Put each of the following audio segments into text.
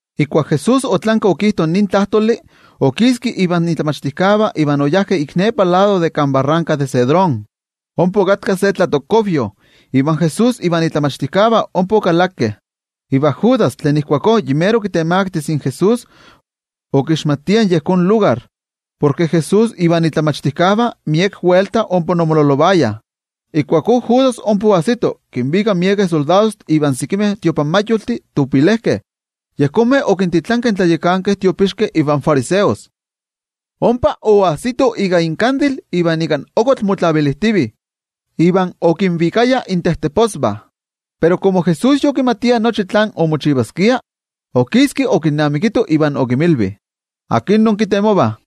Ijkuak Jesús otlanki okijto nin tlajtoli, okiski invan momachtijkeh iva oyajkeh ik nepa lado de kan barranka de Cedrón. Ompa okatka se tlatokkuavyo, iva Jesús ivan momachtijkeh ompa okalakeh. Judas, tlen okitemakti in Jesús, okixmatia yejón lugar, porke Jesús ivan momachtijkeh miek welta ompa omololovayah. Ijkuakó Judas ompa oajsito kinvika miekeh soldadojtih iva sekimeh templojmayoltih. Yejonmeh okintitlankeh in tlayakankeh tiopixkeh ivan fariseos. Ompa oajsitoh ika inkandil iva ika okotl motlavilijtivih, iva okinvikayah intejteposvah. Pero komo Jesús yokimatia nochi tlen omochivaskia, okiski okinnamikito iva okinmilvi: —¿Akin inkitemovah?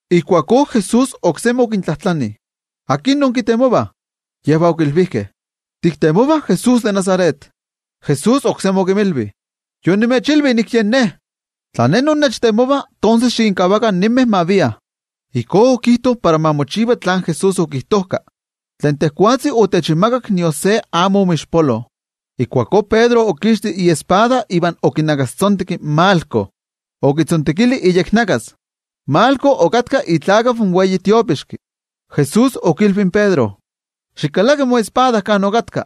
Ijkuakó Jesús oksemi okintlajtlani: —¿Akin inkitemovah? Iva yejvah okilvijkeh: —Tiktemovah Jesús de Nazaret. Jesús oksemi okinmilvi: —Yonimechilvi nik yen Ne. Tla Ne innechtemovah, tonses xikinkavakah ninmeh ma viah. Ijkó okijto para ma mochiva tlen Jesús okijtojka: “Tlen tejwatzi otechinmakak, nion se amo omoixpolo.” Ijkuakó Pedro okixti iespada iva okinakastzonteki in Malco, okitzontekili iyeknakas. Malco okatka itlakeval in wei tiopixki. Jesús okilvi in Pedro: —¡Xikalaki moespada kan okatka!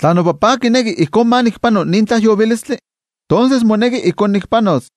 Tla noTajtzi kineki ijkó ma nikpano nin tlajyovilistli, tonses moneki ijkó nikpanos.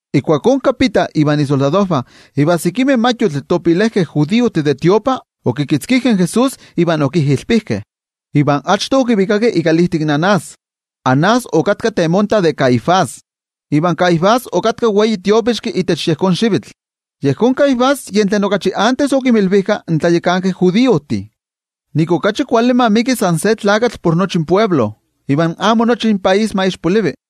Ijkuakó in kapita ivan isoldadojvah, iva sekimeh templojmayoltih, okikitzkijkeh in Jesús iva okijilpijkeh. Achto okivikakeh ikalijtik Anás. Anás okatka temonta de Caifás. Iva Caifás okatka wei tiopixki itech yejón xivitl. Yejón Caifás yen tlen okachi achto okinmilvijka in tlayakankeh judiojtih ke okachi kuali ma ixpolivi san se tlakatl por nochtin toknivah, iva amo nochi topaís ma ixpolivi.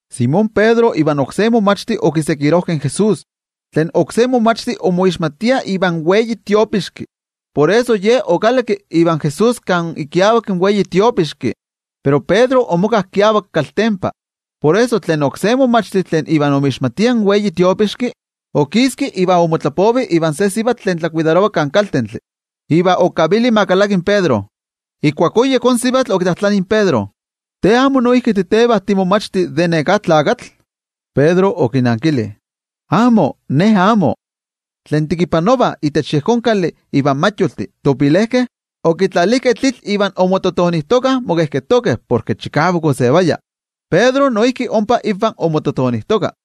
Simón Pedro ivan oksé momachti okiseguirojkeh in Jesús. Tlen oksé momachti omoixmatia ivan wei tiopixki, por eso ye okalakki ivan Jesús kan ikiavak in wei tiopixki. Pero Pedro omoka kiavak kaltempa. Por eso, tlen oksé momachti tlen iva omixmatia in wei tiopixki, okiski iva omotlapovi ivan se sivatl tlen tlakuidarova kan kaltentli, iva okavili ma kalaki in Pedro. Ijkuakó yejón sivatl okitlajtlani in Pedro: —¿Te amo noijki titeva timomachti de neká tlakatl? Pedro okinankili: —Amo, ne amo. Tlen tekipanovah itech yejón kali ivan templojmayoltih, okitlalijkeh tlitl iva omoskojtokah mokejketokeh porke chikavak osevaya. Pedro noijki ompa invah omoskojtoka.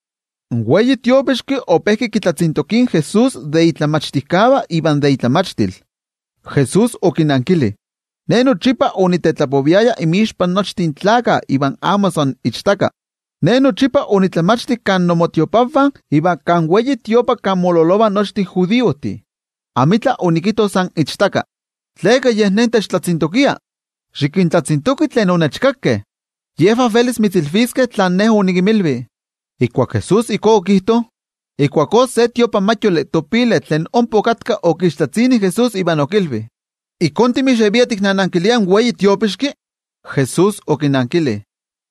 In wei tiopixki ope kitlatzintokia in Jesús aserka de tlen momachtijkeh iva de itlamachtil. Jesús okinankili: —Ne nochipa onitetlapoviaya inmixpa nochtin gentejtih iva amo san ichtaka. Ne nochipa onitlamachti kan tiotlamachtijkaltih iva kan templo kan mololovah nochtin judiojtih. Amitla onikijto san ichtaka. ¿Tleka yej Ne techtlatzintokia? Xikintlatzintoki tlen onechkakeh. Yejvah velis mitzilviskeh tlen Ne onikinmilvi. Ijkuak Jesús ijkó okijto, ijkuakó se templojmayol tlen ompa okatka, okixtlatzini in Jesús iva okilvi: —¿Ijkó timixevia tiknanankilia in wei tiopixki? Jesús okinankili: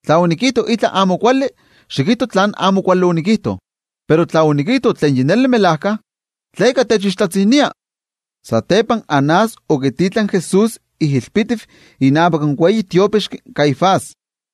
—Tla onikijto itla tlen amo kuali, xikijto tlán amo yompa tlen onikijto. Pero tla onikijto tlen yompa, ¿tleka techixtlatzinia? Satepa Anás okititlanki in Jesús ijilpitiv inavak in wei tiopixki Caifás.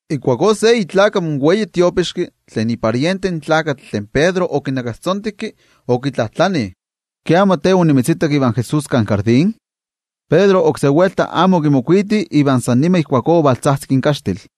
Ijkuakó se itlakeval in wei tiopixki, tlen itla ivan mottah in tlakatl tlen Pedro okinakastzonteki, okitlajtlani: —¿Ke amo te onimitzitak ivan Jesús kan tlatokxochío? Pedro oksé welta amo okimokuiti, iva san nima ijkuakó ovaltzajtzik in kaxtil.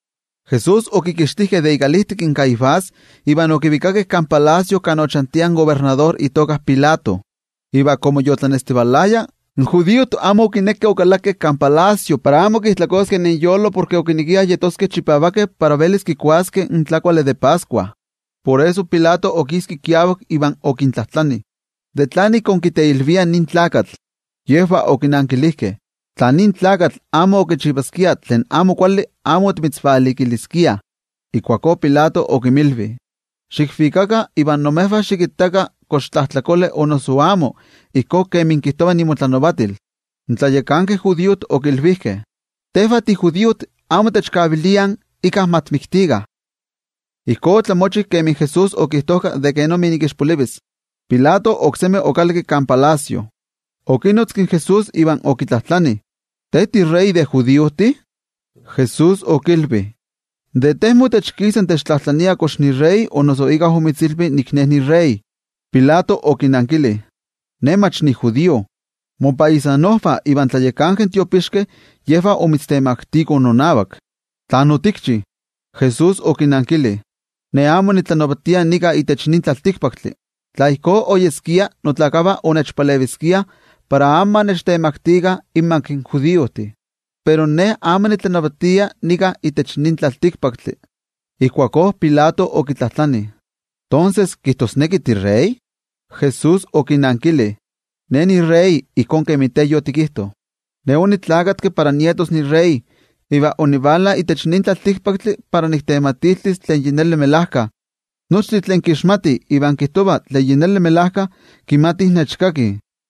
Jesús okikixtijkeh de ikalijtik in Caifás iva okivikakeh kan palacio kan ochantia in kobernador Pilato. Iva komo yotlanestivalaya, in judiojtih amo okinekeh okalakeh kan palacio para amo mijtlakoskeh porke okinekiah yeskeh chipavakeh para velis kikuaskeh in tlakuali de Pascua. Por eso Pilato okiski kiavak, iva okintlajtlani: —¿De tlan ik inkiteilviah nin tlakatl? Yejvah okinankilijkeh: —Nin tlakatl kichiva tlen amo kuali, por eso nika timitzvalikiliah. Ijkuakó Pilato okinmilvi: —Xikvikakah iva imejvah xikittakah kox tlajtlakole o noso amo, ijkó kemi kijtova inmotlanavatil. In tlayakankeh judiojtih okilvijkeh: —Tejvah tijudiojtih amo techkaviliah íkka ma tikmiktikah. Ijkó opanolok kemi Jesús okijtojka de kenik ixpolivis. Pilato oksemi okalakki kan palacio. Okinotzki in Jesús iva okitlajtlani: —¿Te tiwei tlanavati de judiojtih? Jesús okilvi: —¿De te motech kisa techtlajtlania o noso íkka omitzilvi nik Ne niwei tlanavati? Pilato okinankili: —Ne mach nijudío. Mopaisanojvah ivan tlayakankeh tiopixkeh yejvah omitztemaktikoh nonavak. ¿Tlán otikchi? Jesús okinankili: —Ne amo nitlanavatia itech nin tlaltikpaktli. Tla ijkó oyeskia, notlakavah onechpaleviskiah para amo ma nechtemaktikah inmak in judiojtih. Pero Ne amo nitlanavatia itech nin tlaltikpaktli. Ijkuakó Pilato okitlajtlani: —Tonses, ¿kijtosneki tiwei tlanavati? Jesús okinankili: —Te yotikijto ke Ne niwei tlanavati. Para yejón nik onineski iva onivala itech nin tlaltikpaktli para niktematiltis tlen melajkayotl. Nochtin tlen kixmatih iva kijtovah tlen melajkayotl, kimatih nechkakih.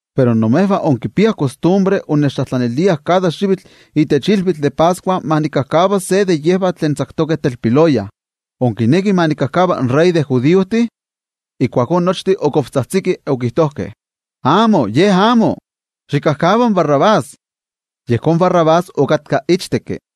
Pero imejvah inkipiah kostumbre innechtlajtlaniliah kada xivitl itech ilvitl de Pascua ma nikajkava se de yejvah tlen tzaktokeh telpiloya. ¿Inkinekih ma nikajkava in wei tlanavati de judiojtih? Ijkuakó nochtin otzajtzikeh chikavak, okijtojkeh: —¡Amo, ye amo! ¡Xikajkava in Barrabás! Yejón Barrabás okatka ichtekki.